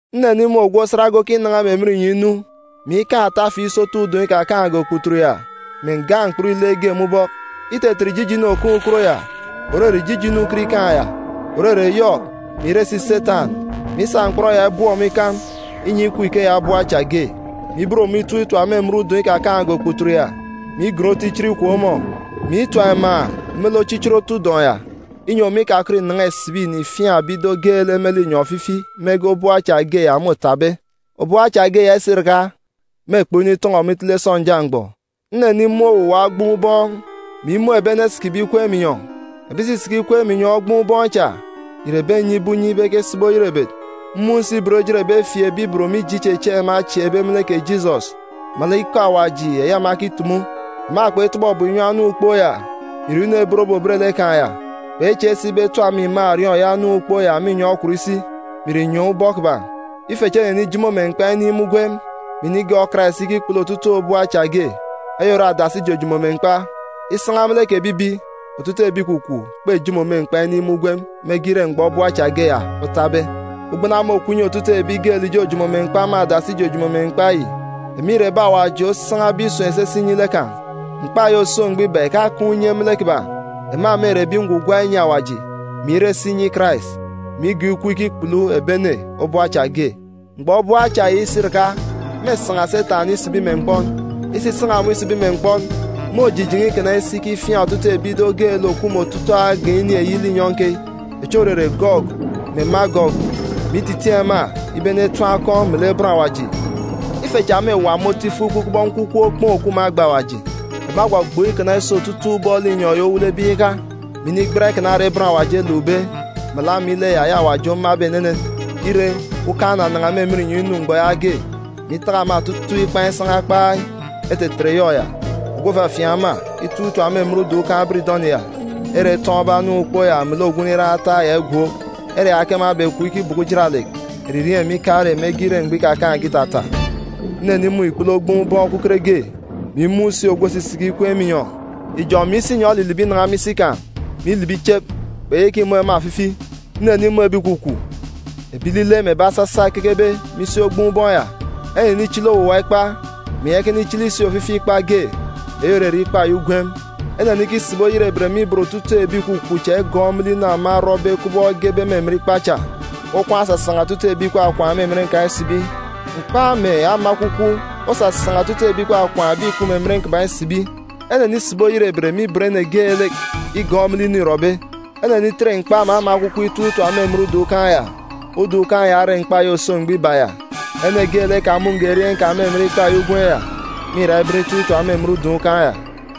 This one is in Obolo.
Nnenimun̄ ogwu osat ge okinan̄a me emen inyọn̄ inu, mè ikaan̄ atafi isotu udọn̄ ikakaan̄ge okputut ya mè nga mkpọn ile ge me ubọk. Itetet ijijinu òkaan̄ ukot ya, òrere ijijinu ukot ikaan̄ ya, òrere Yọk mè ìre si Setan, mè isa mkpọn ya ibọp ọmọ ikam, inyi ikup ikeya obop acha ge, mè iben ọmọ itọp itap me emen udọn̄ ikakaan̄ge okputut ya, mè igon otu ichit ikwek ọmọ, mè itap iman̄ me lek ochichit otu udọn̄ ya, inyi ọmọ ikakọt ìnan̄a ìsibi ìnifiaan̄ ebi ido geelek me linyọn̄ ofifi mege obop acha ge ya môtabe. Obop acha ge ya isiraka, mêkpọk initọn̄ọ ọmọ itele sọnja mgbọ. Nnenimun̄ owuwa ogboon̄ ubọọn̄, mè imun̄ ebi ene esikibe ikweek irek me inyọn̄. Ebi ìsisiki ikweek me inyọn̄ ogboon̄ ubọọn̄ cha ìre ebi enyibe unye ibe ekesibi oyerebet. Mmun̄ si ibot ejit ebi efieekbe ibot mije ichechieek ema echieekbe me lek kè Jisọs, melek ikọ Awaji eyi ema ekitumu. Ema kpetọbọ ebum inyi anam ukpook ya, mè ìre inu ebotbe òbet lek kan̄ ya, kpechieek si ibe etap ema iman̄ òriọọn̄ eyi anam ukpook ya me inyọn̄ okwut isi, mè ìre inyọn̄ ubọk kiban̄. Ife chi enenijomo me mkpa inin̄ me ugwem, mè inigọọk Karais ikikpulu otutuuk obop acha ge. Eyi ore adasi ijojomo me mkpa. (Isan̄a me lek kè ebibi, otutuuk ebi ìkwakwaan̄ kpejomo me mkpa inin̄ me ugwem mege ire mgbọ obop acha ge ya otabe.) Uga ubelejit okup inyi otutuuk ebi geelek ìjojomo me mkpa me adasi ijojomo me mkpa yi. Ema ìre ebi Awaji osan̄abe isun̄ esese inyi lek kan̄. Mkpa eyi òso mgbọ iba ìkakaan̄ unye me lek kiban̄. Ema mêre ebi ngwugwa inyi Awaji, mè ire si inyi Karais, mè igọọk ọmọ ikup ikikpulu ototuuk obop acha ge. Mgbọ obop acha ya isiraka, mêsan̄a Setan isibi me mkpọn. Isisan̄a ọmọ isibi me mkpọn, môjijen̄e ikana isi ikifiaan̄ otutuuk ebi ido geelek òkup me otutuuk agan̄ ini eyi linyọn̄ keyi, echi òrere Gọgu mè Magọgu, mè ititiin̄ ema ibe enetim akọn̄ me lek bọn Awaji. Ife cha mêwa me otu ifuk ikup kubọk nkwukwuuk okpoon̄ òkup me agba awaji. Ema egbọgbọọk inan̄a me otutuuk ubọk linyọn̄ yi owelebe iyaka, mè inu inigban ikana ere m̀gba-ǹgwele ukan̄ ere bọn Awaji elukbe, melek ama ile ya eyi Awaji omabe enenen. Ire, ukan̄ onanan̄a me emen inyọn̄ inu mgbọ yaage, mè itaka ema otutuuk ikpan̄ isan̄a kpai. Etetet Yọk ya, ogwu òfafiaan̄ ema, itọp itap me emen udọn̄ ukan̄ biridọni ya, ere etọọn̄be anam ukpook ya melek ogwu nriran ataak ya igwook. Ere ya ke ema ebekup ikibọkọ ujaralek, eririeen̄ mè ikarek mege ire mgbọ ikakaan̄ge itata. Nnenimun̄ ikpele ogboon̄ ubọọn̄ okuket ge, mè imun̄ si ogwu òsisiki ikweek me inyọn̄. Ijọn̄ mè isinyọn̄ elilibi inan̄a me isi kan̄, mè ilibi ichep, kpeyaka imun̄ ema ofifi. Nnenimun̄ ebi ìkwakwaan̄, ebi ilile, mè ebi asasa ekekebe me isi ogboon̄ ubọọn̄ ya. Enenichili owuwa ikpa, mè iyaka inichili si ofifi ikpa ge, eyi òrere ikpa eyi ugwem. Enenikisibi oyerebet me ibot otutuuk ebi ìkwakwaan̄ cha igọọk me lek inu ema erọbe kubọk egebe me emen ikpa cha. Okwaan̄ osasan̄a otutuuk ebi ìkwakwaan̄ me emen kan̄ isibi. Mkpa mè ama ekwukwu osasan̄a otutuuk ebi ìkwakwaan̄ ebi ìkup me emen kiban̄ isibi. Enenisibi oyerebet me ibot ene geelek igọọk me lek inu îrọbe. Enenitet mkpa mè ama ekwukwu itọp itap me emen udọn̄ ukan̄ ya. Udọn̄ ukan̄ ya ore mkpa eyi òso mgbọ iba ya. Ene geelek ekamun̄ge erieen̄ kan̄ me emen ikpa eyi ugwem ya, mîra iben itọp itap me emen udọn̄ ukan̄ ya.